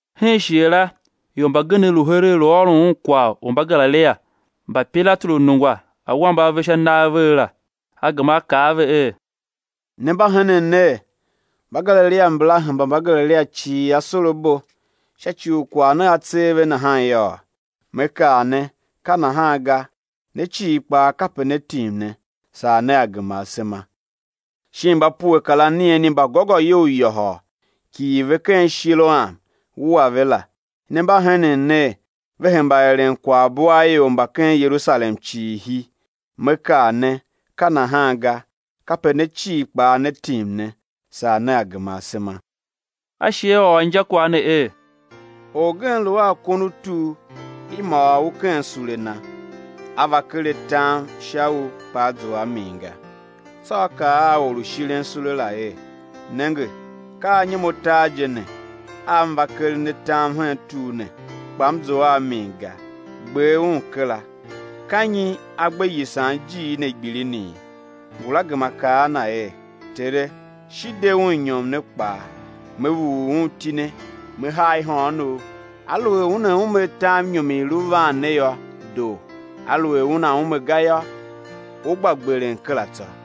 Hen shighe la ior mbagenev lu heregh lu ôron Un kwagh u Mbagalilia mba Pilatu lu nungwa awambe a ve sha nagh vegh la. A gema A kaa a ve er: Ne mba henen ner, Mbagalilia mbala hemba Mbagalilia cii asorabo, sha ci u kwagh ne a tser ve nahan yôô? Me kaa ne, ka nahan ga; ne cii kpaa kape né tim ne, saa nea gema asema. Shin mba pue kar anigheni mba gôgôyou yôhôl, kighir ve ken Shiloam, wua ve la, ne mba henen ner, ve hemba eren kwaghbo a ior mba ken Yerusalem cii hi? Me kaa ne, ka nahan ga, kape ne cii kpaa né tim ne, saa nea gema asema. A shi A ôr injakwagh ne er: Orgen lu a kon u tur, i môôr u ken sule na. A va ker atam sha u, kpa a zua a min ga. Tsô a kaa a or u shiren sule la er: Nenge, ka anyom atar je ne a m va keren atam hen tur ne, kpa m zough a min ga; gber un kera; ka nyi a gbe yisan ijiir ne gbilinii? Ngula gema kaa a na er: Tere, shi de un inyom ne kpaa, me vughul un itine, me haa ihôghonov, aluer una ume atam inyom i i lu van ne yô, doo; aluer una ume ga yô, ú gba gberen kera tsô.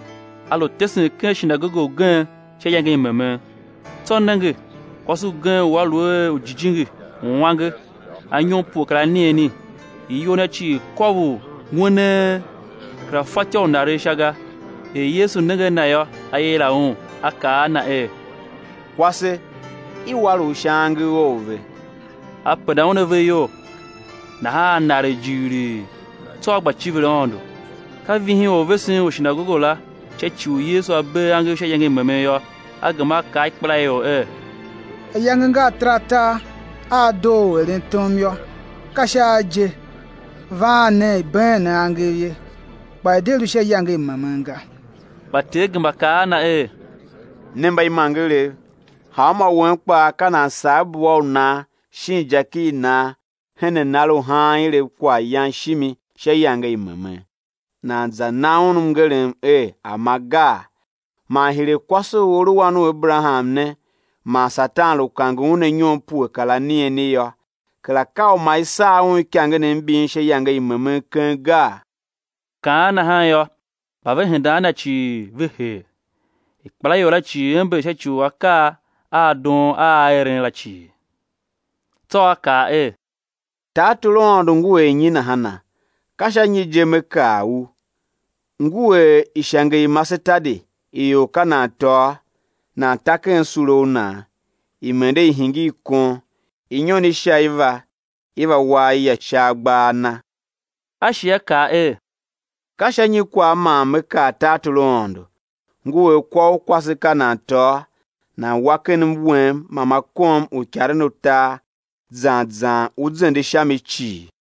A lu tesen ken shinagoge ugen sha iyange i memen. Tsô nenge, kwase ugen u a lu a jijingi u uange anyom pue kar anigheni; iyol na cii kôvor ng'wenee, kera fatyô u naregh sha ga. Er Yesu nenge a na yô, A yila un, A kaa a na er: Kwase, i war u sha angev ou ve. A penda un ave iyol; nahan a naregh jighilii, tsô a gba civir Aôndo. Ka vihin orvesen u shinagoge la sha ci u Yesu A bee angev sha iyange i memen yô, a gema a kaa a ikpelaior er: Ayange nga ataratar a a doo u eren tom yô; ka sha a je, vaan nen, i̱ been ne angev ye, kpa i̱ de lu sha iyange i memen ga. Kpa Ter gema kaa a na er: Ne mbaimangerev, hanmô wen kpaa ka nan sagh bua u nan shin jaki i nan hen anar u haan ilev kwaghyan shimi sha iyange i memen, nan za na un mngerem er a̱ ma gaa? Man hire kwase u a lu wan u Aberaham ne man Satan lu kange un anyom pue kar anigheni yô, kera ka u ma i sagh un ikangenev mbin sha iyange i memen keng gaa? Kaan nahan yô, mba ve hendan a Na cii, ve hee. Ikpelaior la cii ember sha ci u akaa a doon a A eren la cii. Tsô A kaa er: Tartor u Aôndo ngu er nyi nahana? Ka sha nyi je man Me kar u? Ngu er ishange i masetadi i or ka nan tôô, nan ta ken sule u nan; i mende i hingir kon, inyon i sha i va i va wa aya sha agbaa a na. A shi A kaa er: Ka sha nyi kwagh man Me kar tartor u Aôndo? Ngu er kwa u kwase ka nan tôô, nan wa ken mwem ma ma kom uikaren utar zan zan u zende sha mi cii.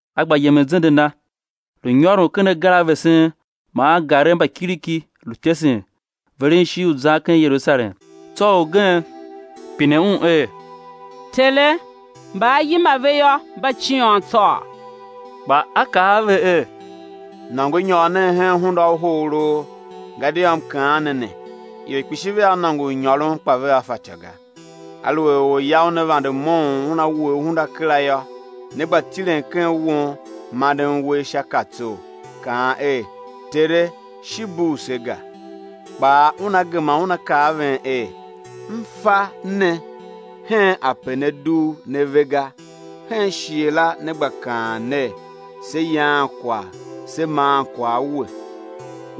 A gba yemen zende Na, lu nyôron ken agar a vesen man angarev mba kiriki, lu tesen, veren ishigh u zan ken Yerusalem. Tsô orgen pine Un er: Tere, mba á yima ve yô, mba ciôn tsôô? Kpa A kaa a ve er: Nôngo nyôr nen hen hunda u hogholoo, gadia M kaan ne ne, ior kpishi vea nôngo u nyôron, kpa vea fatyô ga. Aluer orya una vande moughon una wuhe hunda kera yô, né gba tilen ken won manden uwegh sha katsor, kaan er: Tere, shi bugh se ga! kpaa Una gema Una kaa a ven er: M fa ne hen ape ne dugh ne ve ga. Hen shighe la né gba kaan ner: Se yaan kwagh se maan kwagh a We,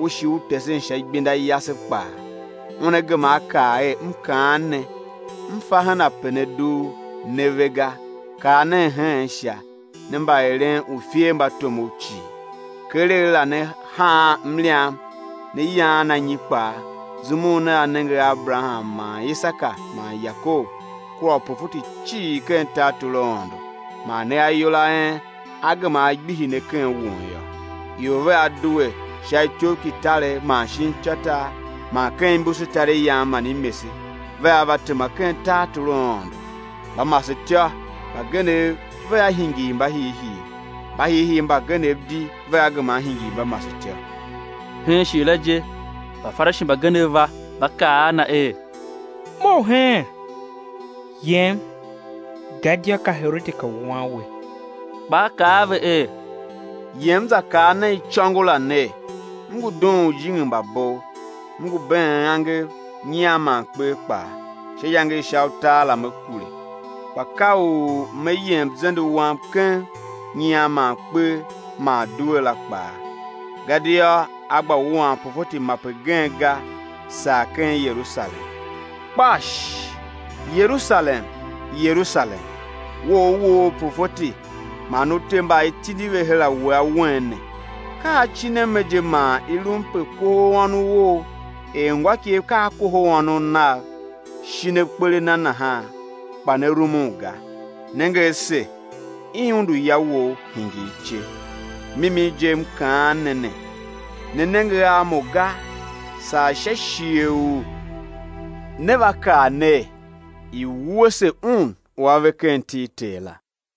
U shi U tesen sha igbenda yase kpaa. Una gema A kaa er: M kaan ne, M fa hen ape ne dugh ne ve ga; kar nen heen sha, ne mba eren uifermbatomov cii. Keregh la né haan mliam né yaan anyi kpaa zum u nea nenge a Aberaham man Isaka man Yakob kua uprofeti cii ken tartor u Aôndo, man ne ayol a en á gema á gbihi ne ken won yô. Ior vea due sha ityoughkitaregh man shin ityôtar man ken imbusutariyan man imese, vea va tema ken tartor u Aôndo. Mbamasetyô mbagenev vea hingir mbahiihii; mbahiihii mbagenev di vea gema á hingir mbamasetyô. Hen shighe la je Mbafarishi mbagenev va, va kaa a Na er: Mough heen, yem, gadia ka Herode ka wuan We. Kpa A kaa a ve er: Yem za kaa nen icôngo la ner: M ngu dughun ujijingi mba bov, M ngu been angev, nyian man kper kpaa, sha iyange i sha utar la Me kure. Kpa ka u me yem zende Wam keng nyian man kper man duela kpaa, gadia á gba wuan profeti mape gen ga saa ken Yerusalem. Kpash! Yerusalem, Yerusalem, we u u woo uprofeti man u te mba i tindi ve her a we, awen ne! Ka acin a me je man i lum pe kohol ônov ou er ngôikegh ka a kohol ônov nav, shin akper a na nahan, kpa ne rumun ga! Nenge ase, i undu ya wou, hingir ice. Mimin je M kaan ne ne, né nenge a Mo ga, saa sha shighe u né va kaa ner: I̱ wuese Un u a ve ken iti i Ter la.